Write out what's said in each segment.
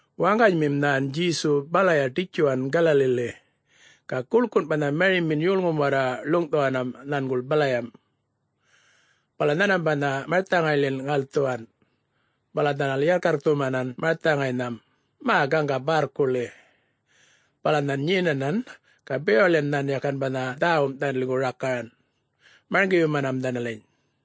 Waŋganymim nhan Djesu balaya ḏitjuwan Galaliḻi. Ga guḻkun banha marimin yolŋum warra ḻuŋꞌthuwanam nhanguḻ balayam. Bala nhanmam banha marthaŋayḻin ŋalthuwan, bala dhanal yarrkyarrkthuman marthaŋaynham mä gaŋga barrkuḻi, bala nhan nyenanan ga bewaḻiyan nhan yakan banha dhäwum dhanaliŋgu rakaran, marŋgiyumanam dhanaliny.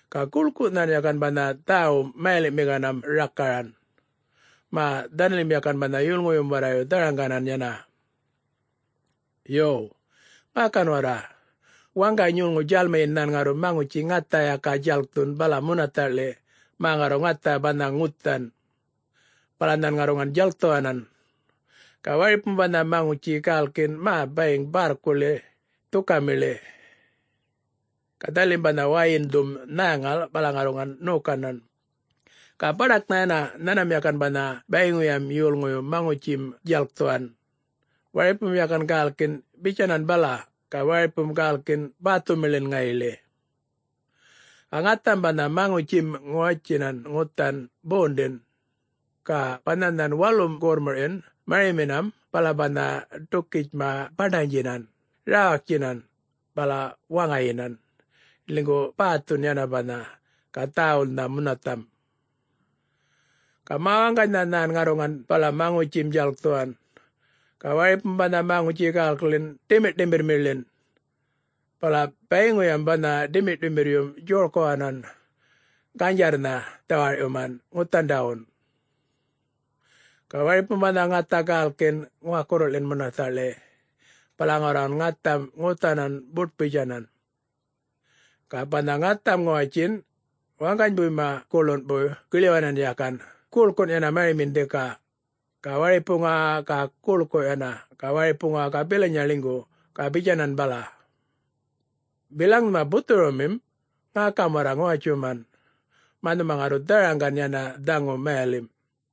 Ga guḻku nhan yakan banha dhäwum mayaliꞌmiŋanam rakaran, mä dhanalim yakan banha yolŋuyum warrayu dharaŋganan yana. “Yo, ŋäkan warra. Waŋgany yolŋu djälmiyin nhan ŋarru maŋutji ŋatha yaka djalkthun bala munathaḻiꞌ mä ŋarru ŋatha banha ŋuthan. Bala nhan ŋarruŋan djalkthuwanan. Ga waripum banha maŋutji gälkin mä bayiŋ bärrkuḻi, dhukamiḻi. Ga dhanalim banha wäyindhum nhäŋal bala ŋarruŋan ṉokanan. Ga baḏaknha yana nhanmam yakan banha bayiŋuyam yolŋuyu maŋutjim djalkthuwan, waripum yakan gälkin bitjanan bala, ga waripum gälkin bäthumiḻin ŋayiḻi. Ga ŋatham banha maŋutjim ŋuwatjinan ŋuthan bondin, ga banha nhan walum gorrmurꞌyin mariminam bala banha ḏukitjma baṉḏanydjinan, räwaktjinan, bala waŋayinan, ḻinygu bäthun yana banha, ga dhäwulnha munathamꞌ. Ga mawaŋganynha nhan ŋarruŋan bala maŋutjim djalkthuwan, ga waripum banha maŋutji gälkin ḏimirrꞌṯimirrmiḻin. Bala bayiŋuyam banha ḏimirrꞌṯimirryum djorkuwanan, ganydjarrnha dhawarꞌyuman ŋuthandawun. Ga waripum banha ŋatha gälkin ŋuwakurruḻin munathaꞌḻi. Bala ŋarruŋan ŋatham ŋuthanam buṯ-bitjanan. Ga banha ŋatham ŋuwatjin, waŋganybuyma guḻunbuy giḻyuwanan yakan guḻkun yana marimin dhika. Ga waripuŋa-a-a ga guḻku yana, ga waripuŋa ga bilanya ḻingu, ga bitjanan bala. Bilaŋ nhuma buthurumim, ŋäkam warra ŋuwatjuman, mä nhuma ŋarru dharaŋgan yana dhaŋu mayalimꞌ.”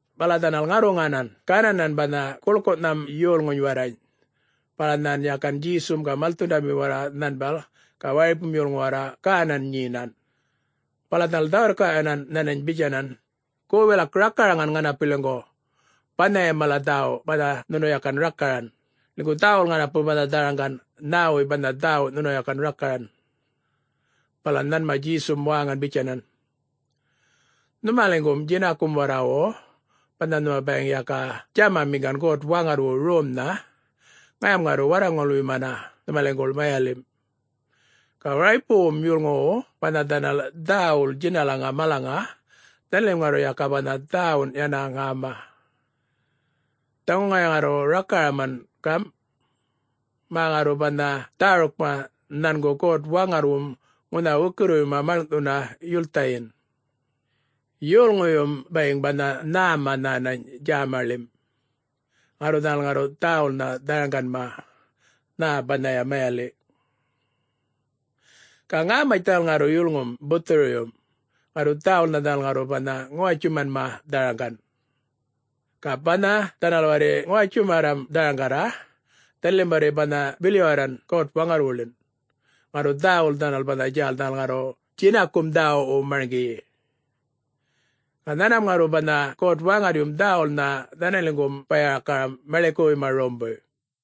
Bala dhanal ŋarruŋanan gananan banha guḻkunham yolŋuny warrany. Bala nhan yakan Djesum ga malthundamim warra nhanbal ga waripum yolŋu warra gänan nyenan. Bala dhanal dhä-wirrkaꞌyuwanan nhanany bitjanan, “Gu wilak rakaraŋan ŋanapiliŋgu banhayam mala dhäwu banha nhunu yakan rakaran, ḻinygu dhäwul ŋanapu banha dharaŋgan. Nhäwuy banha dhäwu nhunu yakan rakaran?” Bala nhanma Djesum wäŋan bitjanan, “Nhumaliŋgum djinakum warrawu, banha nhuma bayiŋ yaka djämamiŋgan God-Waŋarrwu romnha, ŋayam ŋarru warraŋulyumana nhumaliŋguḻ mayalimꞌ. Ga waripuŋuwum yolŋuwu banha dhanal dhäwul djinalaŋa malaŋa, dhanalim ŋarru yaka banha dhäwun yana ŋäma. Dhaŋu ŋaya ŋarru rakaraman gamꞌ, mä ŋarru banha dhärukma nhangu God-Waŋarrwum ŋunha wukirriwuyma maḻŋꞌthuna yulthayin. ‘Yolŋuyum bayiŋ banha nhäma nhänany djämaḻim. ŋarru dhanal ŋarru dhäwulnha dharaŋganma, nhä banhaya mayaliꞌ. Ga ŋämatj dhanal ŋarru yulŋum buthuruyum, ŋarru dhäwulnha dhanal ŋarru banha ŋuwatjumanma dharaŋgan. Ga banha dhanal warri ŋuwatjumarram dharaŋgarra, dhanalim warri banha bilyuwarran God-Waŋarrwuḻin. Ŋarru dhäwul dhanal banha djäl dhanal ŋarru djinakum dhäwuꞌwu marŋgiyi. Ga nhanmam ŋarru banha God-Waŋarryum dhäwulnha dhanaliŋgum baya-rakaram maḻikuwuyma rombuy.’”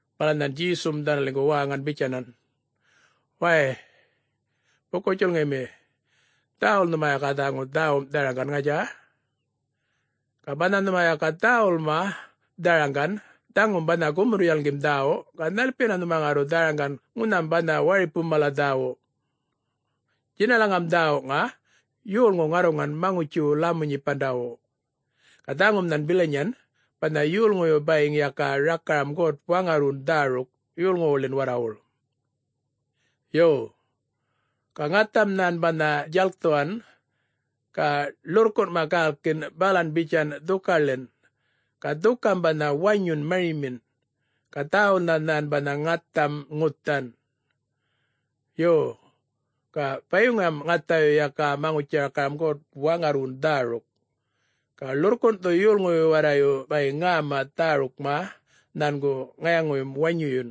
Bala nhan Djesum dhanaliŋgu wäŋan bitjanan, “Wäy, buku-djulŋimi, dhäwul nhuma yaka dhaŋu dhäwum dharaŋgan, ŋatja? Ga banha nhuma yaka dhäwulma dharaŋgan dhaŋum banha gumurr-yalŋgim dhäwu, ga nhalpiyana nhuma ŋarru dharaŋgan ŋunham banha waripum mala dhäwu? Djinalaŋam dhäwuŋa, yolŋu ŋarruŋan maŋutjiwu lämu-nyipandawu. Ga dhaŋum nhan bilanyan, banha yolŋuyu bayiŋ yaka rakaram God-Waŋarrwun dhäruk yolŋuwuḻin warrawuḻ. Yo, ga ŋatham nhan banha djalkthuwan, ga ḻurrkunꞌma gälkin balan bitjan dhukaḻin. Ga dhukam banha wanyun marimin, ga dhäwulnha nhan banha ŋatham ŋuthan. Yo, ga bayiŋuyam ŋathayu yaka maŋutji-rakaram God-Waŋarrwun dhäruk. Ga ḻurrkunꞌthu yolŋuyu warrayu bayiŋ ŋäma dhärukma nhangu ŋayaŋuyum wanyuyun,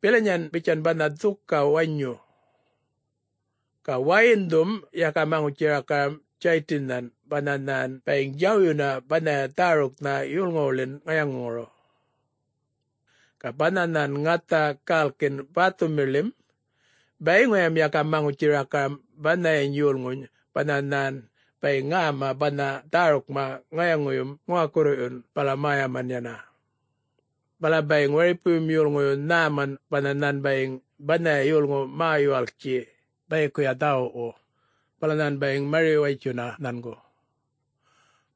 bilanyan bitjan banha dhuka wanyu. Ga wäyindhum yaka maŋutji-rakaram Djaytinnhan banha nhan bayiŋ djawyuna banhaya dhäruknha yolŋuwuḻin ŋayaŋuŋuru. Ga banha nhan ŋatha gälkin bäthumiḻim, bayiŋuyam yaka maŋutji-rakaram banhayan yolŋuny banha nhan bayiŋ ŋäma banha dhärukma ŋayaŋuyum ŋuwakurruyun bala mäyaman yana. Bala bayiŋ waripuyum yolŋuyu nhäman banha nhan bayiŋ banhaya yolŋu mä-yuwaltji bayikuya dhäwuꞌwu, bala nhan bayiŋ mari-watjuna nhangu.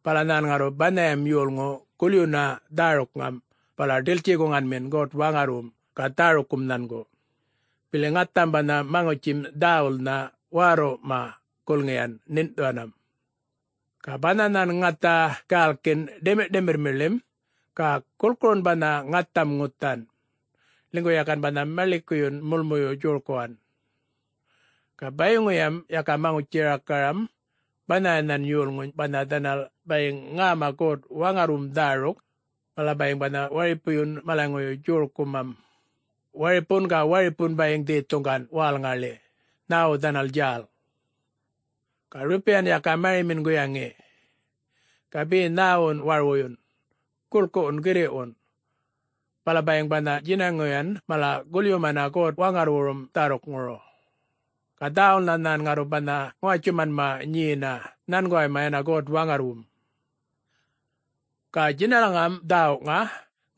Bala nhan ŋarru banhayam yolŋu gulyuna dhärukŋam bala ḏiltji-guŋanmin God-Waŋarrwum ga dhärukkum nhangu, bili ŋatham banha maŋutjim dhäwulnha wärrurrꞌma gulŋiyan ṉiṉꞌthuwanam. Ga banha nhan ŋatha gälkin ḏimirrꞌṯimirrmiḻim, ga gulkurun banha ŋatham ŋuthan, ḻinygu yakan banha maḻikuyun mulmuyu djorkuwan. Ga bayiŋuyam yaka maŋutji-rakaram banhayanhan yolŋuny banha dhanal bayiŋ ŋäma God-Waŋarrwum dhäruk, bala bayiŋ banha waripuyun malaŋuyu djorkumam. Waripun ga waripun bayiŋ dhethuŋgan wälŋaḻi, nhäwu dhanal djäl. Ga rrupiyan yaka marimim guyaŋi, ga be nhäwun warwuyun, guḻkuwun, girriꞌwun. Bala bayiŋ banha djinaŋuyan mala gulyumanma God-Waŋarrwurum dhärukŋuru, ga dhäwulnha nhan ŋarru banha ŋuwatjumanma nyena nhanguwayma yana God-Waŋarrwum. Ga djinalam dhäwuŋa,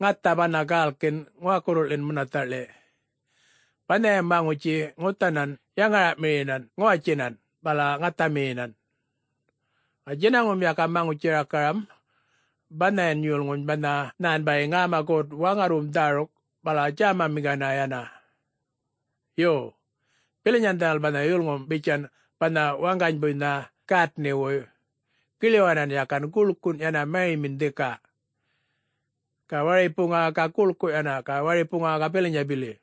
ŋatha banha gälkin ŋuwakurruḻim munathaꞌḻi, banhayam maŋutji ŋuthanan yaŋaraꞌmiyinan ŋuwatjinan, bala ŋathamiyinan. Ga djinaŋum yaka maŋutji-rakaram banhayan yolŋuny banha nhan bayiŋ ŋäma God-Waŋarrwum dhäruk bala djämamiŋgana yana. Yo, bilanyan dhanal banha yulŋum bitjan banha waŋganybuynha gätniꞌwuy, giḻyuwanan yakan guḻkun yana mariminan dhika. Ga waripuŋa-a-a ga guḻku yana, ga waripuŋa ga bilanya bili.”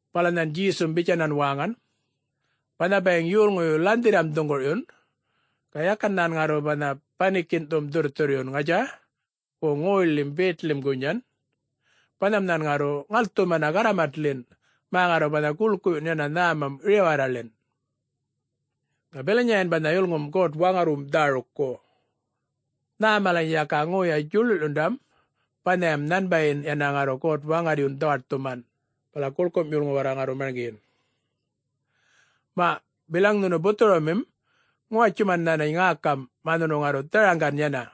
Bala nhan Djesum bitjanan wäŋan, “Banha bayiŋ yolŋuyu lanhdhirram dhuŋgurꞌyun, ga yakan nhan ŋarru banha banikinꞌthum dhurrthurryun, ŋatja?... wo ŋoyḻim betḻim gunyan. Banham nhan ŋarru ŋalthumana garramatḻin, mä ŋarru banha guḻkuꞌyun yana nhämam riwarraḻin. Ga bilanyayan banha yulŋum God-Waŋarrwum dhärukku. Nhä malany yaka ŋoya djuḻuḻyundam, banhayam nhanbayin yana ŋarru God-Waŋarryun dhawaṯthuman, bala guḻkum yolŋu warra ŋarru marŋgiyin. Maꞌ, bilaŋ nhunu buthurumim, ŋuwatjuman nhänany ŋäkam mä nhunu ŋarru dharaŋgan yana.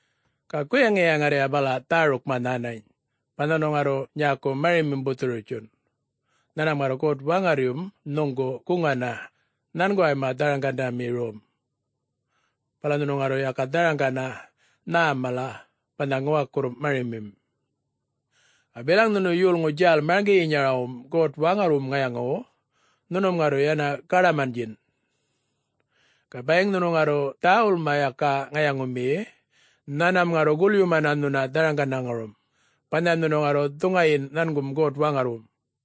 Ga guyaŋiya ŋarrya bala dhärukma nhänany. Banha nhunu ŋarru nyäku marimim buthuru-bitjun, nhanmam ŋarru God-Waŋarryum nhuŋgu guŋana nhanguway dharaŋgandami rom, banha nhunu ŋarru yaka dharaŋgana nhäm mala banha ŋuwakurrum marimim. Ga bilaŋ nhunu yolŋu djäl marŋgiyinyarawum God-Waŋarrwurum ŋayaŋuwu, nhunum ŋarru yana gaḏamandjin. Ga bayiŋ nhunu ŋarru dhäwulma yaka ŋayaŋumiyi, nhanmam ŋarru gulyumana nhuna dharaŋandaŋurum, banhayam nhunu ŋarru dhuŋayin nhangum God-Waŋarrwum.”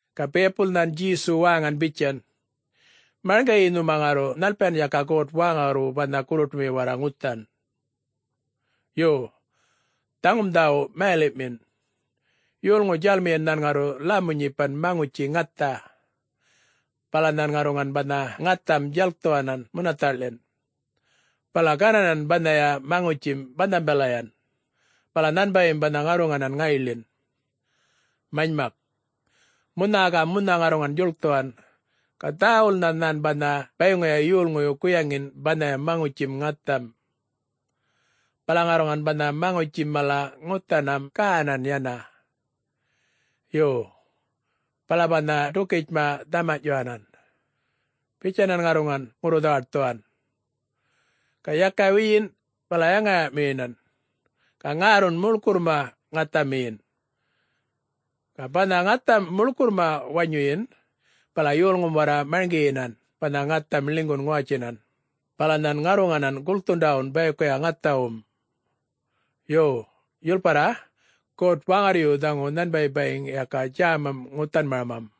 Ga biyapul nhan Djesu wäŋan bitjan, “Marŋgiyi nhuma ŋarru nhalpiyan yaka God-Waŋarrwu banha gurruṯumi warra ŋuthan. Yo, dhaŋum dhäwu mayaḻiꞌmin: Yolŋu djälmiyin nhan ŋarru lämu-nyipan maŋutji ŋatha, bala nhan ŋarruŋan banha ŋatham djalkthuwanan munathaꞌḻin, bala gananan banhaya maŋutjim banhambalayan, bala nhanbayim banha ŋarruŋanan ŋayiḻin. Manymak, munha ga munha ŋarruŋan djuḻkthuwan ga dhäwulnha nhan banha bayiŋuya yolŋuyu guyaŋin banhaya maŋutjim ŋatham. Bala ŋarruŋan banha maŋutjim mala ŋuthanam gänan yana. Yo, bala banha ḏukitjma dhamanyꞌtjuwanan, bitjanan ŋarruŋan ŋurru-dhawaṯthuwan. Ga yaka wiyin, bala yaŋaraꞌmiyinan, ga ŋärrun muḻkurrma ŋathamiyin. Ga banha ŋatham muḻkurrma wanyuyin, bala yolŋum warra marŋgiyinan banha ŋatham ḻinygun ŋuwatjinan, bala nhan ŋarruŋanan gulkthundawun bayikuya ŋathawum. Yo, yulparra, God-Waŋarryu dhaŋu nhanbay bayiŋ yaka djämam ŋuthanmaramam.”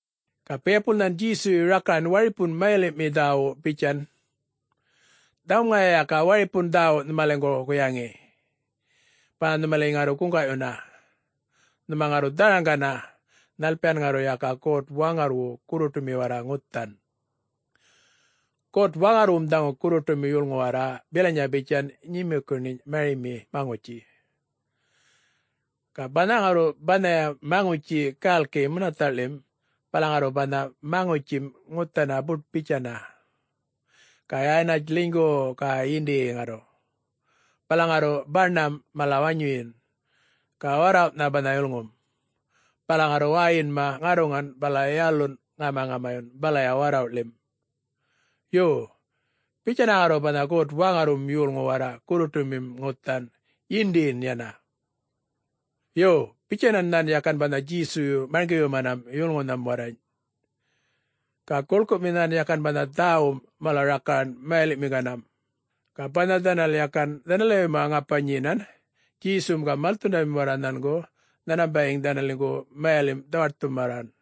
Ga biyapul nhan Djesuyu rakaran waripun mayaliꞌmi dhäwu bitjan, “Dhaŋum ŋaya yaka waripun dhäwu nhumaliŋgu guyaŋi, banha nhumaliny ŋarru guŋgaꞌyuna, nhuma ŋarru dharaŋgana, nhalpiyan ŋarru yaka God-Waŋarrwu gurruṯumi warra ŋuthan. God-Waŋarrwum dhaŋu gurruṯumi yolŋu warra bilanya bitjan nyumukuṉinyꞌ marimi maŋutji. Ga banha ŋarru banhaya maŋutji gälki munathaꞌḻim bala ŋarru banha maŋutjim ŋuthana buṯ-bitjana, ga yanatj ḻinygu ga yindiyi ŋarru, bala ŋarru baṉamꞌ mala wanyuyin, ga warrawꞌnha banha yulŋum. Bala ŋarru wäyinma ŋarruŋan bala yalunꞌ ŋamaŋamayun balaya warrawꞌḻim. Yo, bitjana ŋarru banha God-Waŋarrwum yolŋu warra gurruṯumim ŋuthan, yindiyin yana.” Yo, bitjanan nhan yakan banha Djesuyu marŋgiyumanam yolŋunham warrany. Ga guḻkumi nhan yakan banha dhäwum mala rakaran mayaliꞌmiŋganam. Ga banha dhanal yakan dhanaliwayma ŋapa nyenan, Djesum ga malthundamim warra nhangu, nhanmam bayiŋ dhanaliŋguḻ mayalimꞌ dhawaṯthumarran.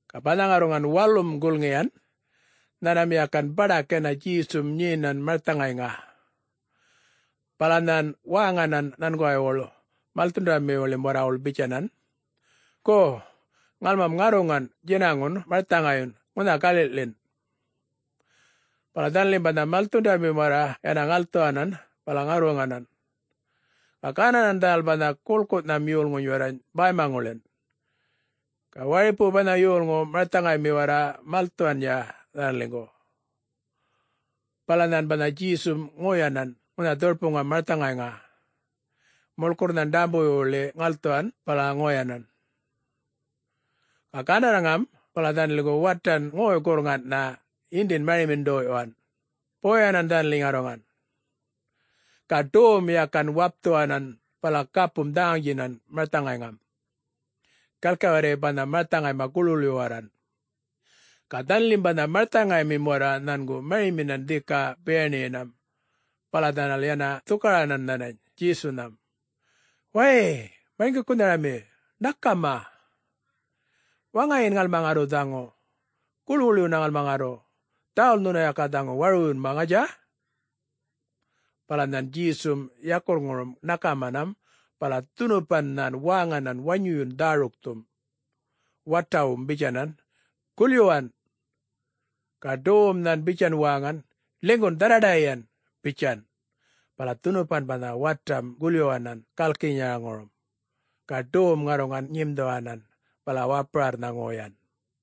Ga banha ŋarruŋan walum gulŋiyan, nhanmam yakan baḏak yana Djesum nyenan marthaŋayŋa. Bala nhan wäŋanan nhanguwaywuḻ malthundamiwuḻim warrawuḻ bitjanan, “Gu, ŋalmam ŋarruŋan djinaŋun marthaŋayyun ŋunha galiꞌḻin.” Bala dhanalim banha malthundamim warra yana ŋalthuwanan, bala ŋarruŋanan. Ga gananan dhanal banha guḻkunham yolŋuny warrany bäymaŋuḻin. Ga waripu banha yolŋu marthaŋaymi warra malthuwanya dhanaliŋgu. Bala nhan banha Djesum ŋoyanan ŋunha dhurpuŋam marthaŋayŋa, muḻkurr nhan ḏämbuwuyḻi ŋalthuwan bala ŋoyanan. Ga gandarrŋam bala dhanaliŋgu watan ŋoy-gurrŋanꞌnha yindin marimin ḏoyꞌyuwan, boyanan dhanaliny ŋarruŋan. Ga ḏowum yakan wapthuwanan bala gapum dhaŋaŋdjinan marthaŋayŋam, gaḻki warri banha marthaŋayma guḻwuḻyuwarran. Ga dhanalim banha malthundamim warra nhangu mariminan dhika biyaṉiyinam bala dhanal yana dhukaranan nhanany Djesunham, “Wäy Marŋgikunharami, ṉakama, waŋayin ŋalma ŋarru dhaŋu, guḻwuḻyuna ŋalma ŋarru,... dhäwul nhunu yaka dhaŋu warwuyunma, ŋatja?” Bala nhan Djesum yakurrŋurum ṉakamanam bala dhunupan nhan wäŋanan wanyuyun dhärukthum, watawum bitjanan, “Gulyuwan!” ga ḏowuwum nhan bitjan wäŋan, “Ḻinygun dharraḏayiyan!” bitjan. Bala dhunupan banha watam gulyuwanan gälkinyaŋurum, ga ḏowum ŋarruŋan nyimdhuwanan bala wapurarrnha ŋoyan.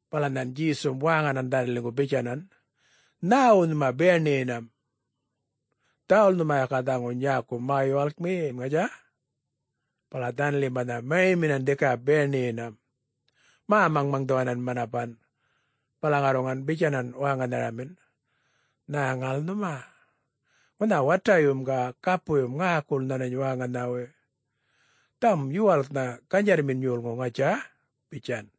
Bala nhan Djesum wäŋanan dhanaliŋgu bitjanan, “Nhäwu nhuma biyaṉiyinam?... dhäwul nhuma yaka dhaŋu nyäku ma-yuwalkmiyi, ŋatja?” Bala dhanalim banha mariminan dhika biyaṉiyinam, mä-maŋmaŋdhuwanan manapan bala ŋarruŋan bitjanan wäŋanharamin, “Nhäŋal nhuma? Ŋunha watayum ga gapuyum ŋäkul nhanany wäŋanhawuy! Dhaŋum yuwalknha ganydjarrmin yolŋu, ŋatja?” bitjan.